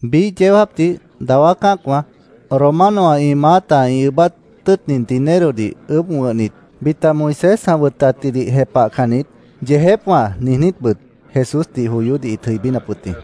Biíh yeó jáapdih dawá cã́acwã, Romanowã ĩ maáta ĩ ʉʉ́bát tʉ́ʉtnit dinerodih ʉʉ́bh wʉ̃hnit, bita Moisés ã wʉtatjidih jepahcannit “Yeejépwã”, niijnítbʉt Jesúsdih joyódih ĩt jʉibínap wʉt jĩ.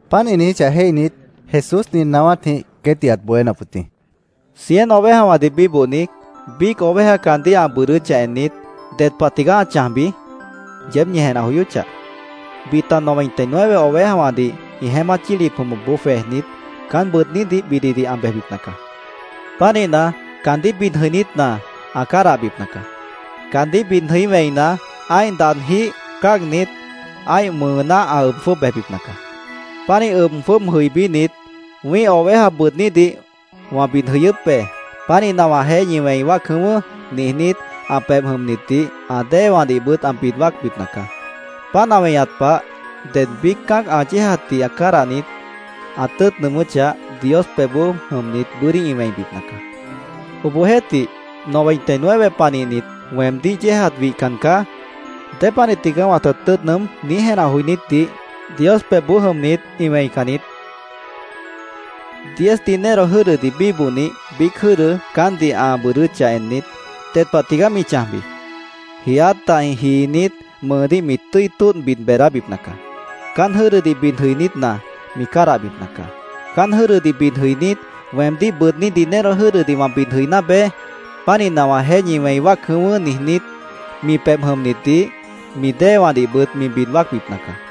Páant ĩ niijíchah jéihnit, Jesús nin naáwátjĩh queétdih ãt bohénap wʉt jĩ: “Cien ovejawãdih bíbohni, biíc oveja caandíh ã bʉʉdʉ́chah ennit, ¿ded pah tigaá ã chãjbi? yeéb ñi jenah joyóchah. Bita noventa y nueve ovejawãdih ĩ jeémát yílip jʉmʉpboó jwejnit, caán bʉʉdnídih bididih ã bejbipna caá. Pánihna, caandíh bid jʉinítna, ã cádahbipna caá. Caandíh bid jʉí wẽina, ã́ih daadjíh mao cáagnit, ã́ih mʉʉná ã ʉb jwʉ́ʉb bejbipna caá. Pánih ʉb jwʉ́ʉb jʉibínit, ‘Wĩ́ih oveja bʉʉdnídih wã bid jʉyʉ́p be. Pánihna, wãjeéh ñi wẽi wáac jʉ̃ʉ́wʉ́’, niijnít, ã pebh jʉmnitdih, ã déewãdihbʉt ã bid wáacbipna caá. Páant ã weñat pah, ded biíc cã́ac ã yéejatdih cádahnit, ã tʉ́ʉt nʉʉmʉ́chah, Dios pebhboó jʉmnit bʉ́dí ĩ wẽibipna caá. Obohjeéhtih, noventa y nueve panihnit ‘Weemdíh yéejat wihcan caá. ¿Dépanih tigaá wãta tʉ́ʉt nʉʉ́m?’ niíj jenah joinítdih Dios pebhboó jʉmnit ĩ wẽican niít”, Jesús ãt niijíp wʉt jĩ. “Diez dinero jʉ́dʉ bíbohnih biíc jʉ́dʉ caántdih ã bʉʉdʉ́chah ennit, ¿ded pah tigaá mi chãjbi? Jiiát dahjĩh jiinít, mʉʉdíh mi tʉ́i tóodh bid beedábipna caá. Caán jʉ́dʉdih bid jʉinítna, mi cádahbipna caá. Caán jʉ́dʉdih bid jʉinít, ‘Weemdíh bʉʉdní dinero jʉ́dʉdih wã bid jʉiná beé. Pánihna, wãjeéh ñi wẽi wáac jʉ̃ʉ́wʉ́’, niijnít, mi pebh jʉmnitdih, mi déewãdihbʉt mi bid wáacbipna caá.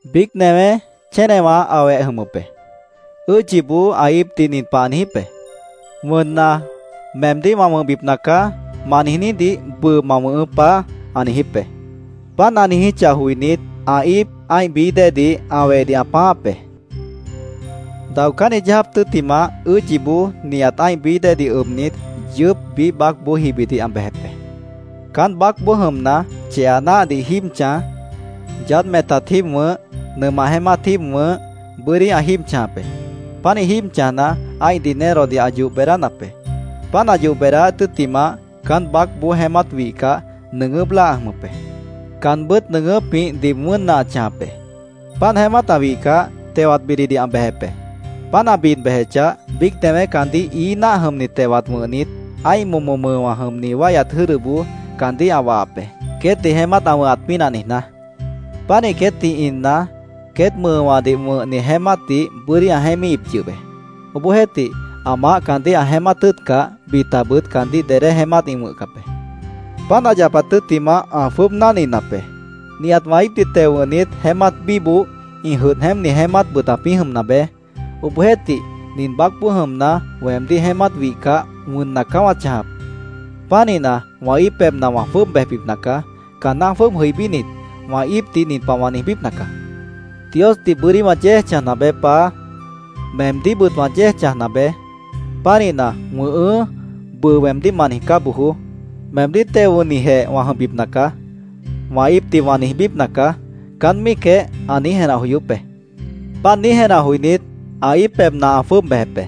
“Biíc newé chénewã ã weh jʉmʉp be. Ʉ́ʉdyiboó ã íipdih nin pah ã niijíp be: ‘ “Wʉnna, meemdíh wã wʉ̃hbipna caá”, ma niijnídih bʉʉ ma wʉ̃hʉʉ́, Paá’, ã niijíp be. Páant ã niijíchah joinít, ã íip ã́ih bií déedih ã wehdih ã pãááp be. Daocánni yeó jáap tʉ́ttimah, ʉ́ʉdyiboó nihat ã́ih bií déedih ʉbnit, yʉʉ́p biíh baácboó jibidih ã bejep be. Caán baácboó jʉmna, cheha náahdih jíib chãj, yaádh metat jíib wʉ̃h, nʉmah jeémát jíib wʉ̃h, bʉ́dí ã jíib chãjap be. Pánih jíib chãjna, ã́ih dinerodih ã yoh beedánap be. Páant ã yoh beedáát tʉ́ttimah, caán baácboó jeémát wihcah, nʉʉgʉ́p láa ã jʉmʉp be. Caanbʉ́t nʉʉgʉ́pjĩh diib wʉ́nna ã chãjap be. Páant jeémát ã wihcah, tewat bididih ã bejep be. Páant ã bid bejechah, biíc newé caandíh ií náah jʉmni tewat wʉ̃hnit, ã́ih momo mʉʉwã jʉmni wáihyat jʉ́dʉboó caandíh ã wahap be, queétdih jeémát ã wʉ̃hat pínah niijná. Pánih queétdih inna, queét mʉʉwãdih wʉ̃hni jeémátdih bʉ́dí ã jeémíhip yʉh be. Obohjeéhtih, ã maáh caandíh ã jeémát tʉ́ʉtcah, bitabʉt caandíh dedé jeémát ĩ wʉ̃hcap be. Páant ã yapat tʉ́ttimah, ã jwʉ́ʉb náhninap be, ‘Nihat wã íipdih teo wʉ̃hnit jeémát bíboh, ĩ jʉdh jeémpni jeémátbʉt ãpĩ́ jʉmna beé. Obohjeéhtih, nin baácboó jʉmna, weemdíh jeémát wihcah, wʉnna caá wã chãjap. Pánihna, wã íip pebhna wã jwʉ́ʉb bejbipna caá. Caanná jwʉ́ʉb jʉibínit, wã íipdih nin pah wã niijbípna caá: “Diosdih bʉ́dí wã yéej chãjna beé, Paá. Meemdíhbʉt wã yéej chãjna beé. Pánihna, ¡‘Wʉ̃ʉhʉ́’, bʉʉ weemdíh ma niijcá bojoó! Meemdíh teo wʉ̃hnijeh wã jʉmbipna caá”, wã íipdih wã niijbípna caá’, caán míicjeh ã niíj, jenah joyóp be. Páant niíj jenah joinít, ã íip pebhna ã jwʉ́ʉb bejep be.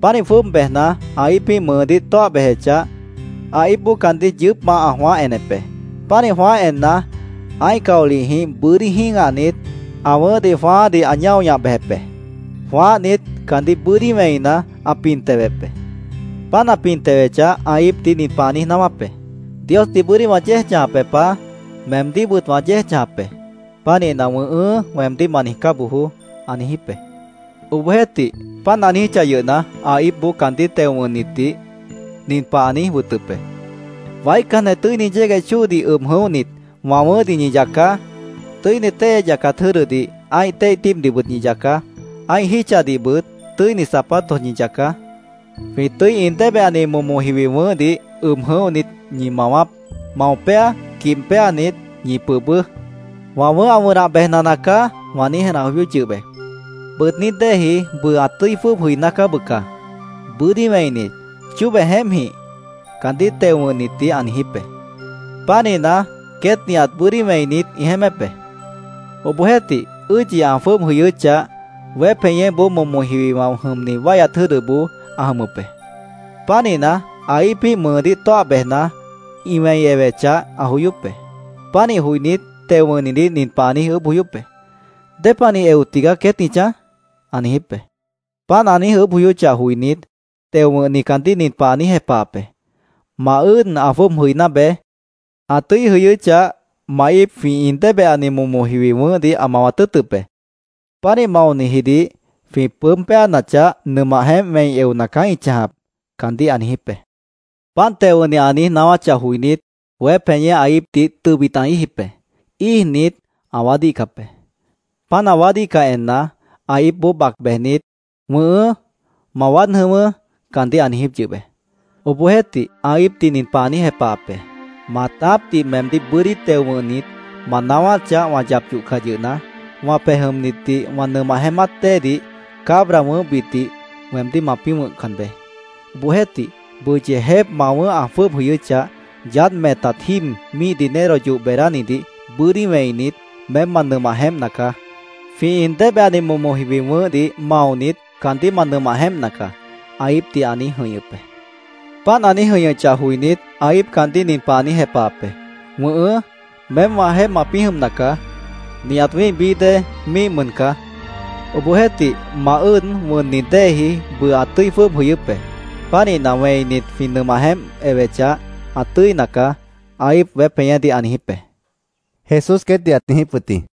“Pánih jwʉ́ʉb bejna, ã íipíh mʉʉdíh ã tóah bejechah, ã íipboó caandíh yʉʉ́pmah ã jwãáh enep be. Pánih jwãáh enna, ã́ih caolihjĩh bʉ́dí jĩ́gahnit, ã wʉ̃ʉ́hdih jwãáádih ã ñáo ñah bejep be. Jwãáhnit, caandíh bʉ́dí wẽina, ã pin tewep be. Páant ã pin tewechah, ã íipdih nin pah ã niíj naáwáp be: ‘Diosdih bʉ́dí wã yéej chãjap be, Paá. Meemdíhbʉt wã yéej chãjap be. Pánihna, “Wʉ̃ʉhʉ́”, weemdíh ma niijcá bojoó’, ã niijíp be. Obohjeéhtih, páant ã niijíchah yʉhna, ã íipboó caandíh teo wʉ̃hnitdih nin pah ã niíj wʉtʉp be: ‘Waícanjeh tʉ́ini yégueh chóodih ʉb jʉ̃óhnit, wã wʉ̃ʉ́hdih ñi yacaá. Tʉ́ini téihya yacat jʉ́dʉdih ã́ih téih tíibdihbʉt ñi yacaá. Ã́ih jítchadihbʉt tʉ́ini zapatos ñi yacaá. Jwĩ tʉ́i in débehani momo jiwi wʉ̃ʉ́hdih ʉb jʉ̃óhnit, ñi mawaáp. Mao péa, quibh péanit, ñi pʉʉbʉ́. “Wã wʉ̃ʉ́h ã wʉnah bejna nacaá”, wã niíj jenah joyóp yʉh be. Bʉʉdní déeji bʉʉ ã tʉ́i jwʉ́ʉb jʉiná caá, bʉca. Bʉ́dí wẽinit, chóbe jeémpjĩh’, caandíh teo wʉ̃hnitdih ã niijíp be. Pánihna, queét nihat bʉ́dí wẽinit, ĩ jeémép be. “Obohjeéhtih, ʉ́ʉdyi ã jwʉ́ʉb jʉyʉ́chah, weép jeñéboó momo jiwiwã jʉmni wáihyat jʉ́dʉboó ã jʉmʉp be. Pánihna, ã íipíh mʉʉdíh tóah bejna, ĩ wẽi ewechah, ã joyóp be. Pánih joinít, teo wʉ̃hnidih nin pah ã niíj ʉʉ́bh joyóp be: ‘¿Dépanih eo tigaá queét ĩ chãj?’ ã niijíp be. Páant ã niíj ʉʉ́bh joyóchah joinít, teo wʉ̃hni caandíh nin pah ã niíj jepahap be: ‘Ma ʉ́ʉd ã jwʉ́ʉb jʉiná beé. Ã tʉ́i jʉyʉ́chah, ma íip jwĩ in débehani momo jiwi wʉ̃ʉ́hdih ã mawat tʉ́ʉtʉp be. Pánih maonijidih jwĩ pʉʉ́b péanachah, nʉmah jeémp wẽi eona caá ĩ chãjap’, caandíh ã niijíp be. Páant teo wʉ̃hni ã niíj naáwáchah joinít, weép jeñé ã íipdih tʉbit ã íijip be. Íijnit, ã waádíhcap be. Páant ã waádíhcah enna, ã íipboó bac bejnit, ‘Wʉ̃ʉhʉ́, ma waád jʉ̃ʉ́wʉ́’, caandíh ã niijíp yʉh be. Obohjeéhtih, ã íipdih nin pah ã niíj jepahap be: ‘Maatápdih meemdíh bʉ́dí teo wʉ̃hnit, ma naáwáchah wã yap yohcah yʉhna, wã pej jʉmnitdih wã nʉmah jeémát déedih cabra wʉ̃ʉ́hbitdih weemdíh mapĩ́ wʉ̃hcan beé. Obohjeéhtih, bʉʉ yeejép ma wʉ̃ʉ́h ã jwʉ́ʉb jʉyʉ́chah, yaádh metat jíib míih dinero yoh beedánidih bʉ́dí wẽinit, meém ma nʉmah jeémpna caá. Jwĩ in débehani momo jiwi wʉ̃ʉ́hdih maonit, caandíh ma nʉmah jeémpna caá’, ã íipdih ã niíj jʉ̃ihñʉp be. “Páant ã niíj jʉ̃ihñʉchah joinít, ã íip caandíh nin pah ã niíj jepahap be: ‘Wʉ̃ʉhʉ́, meém wãjeéh mapĩ́ jʉmna caá. Nihat wĩ́ih bií déedih míih mʉn caá. Obohjeéhtih, ma ʉ́ʉd wʉnni déeji bʉʉ ã tʉ́i jwʉ́ʉb jʉyʉ́p be. Pánihna, wẽinit, jwĩ nʉmah jeémp ewechah, ã tʉ́ina caá’, ã íip weép jeñédih ã niijíp be”, Jesús queétdih ãt niijíp wʉt jĩ.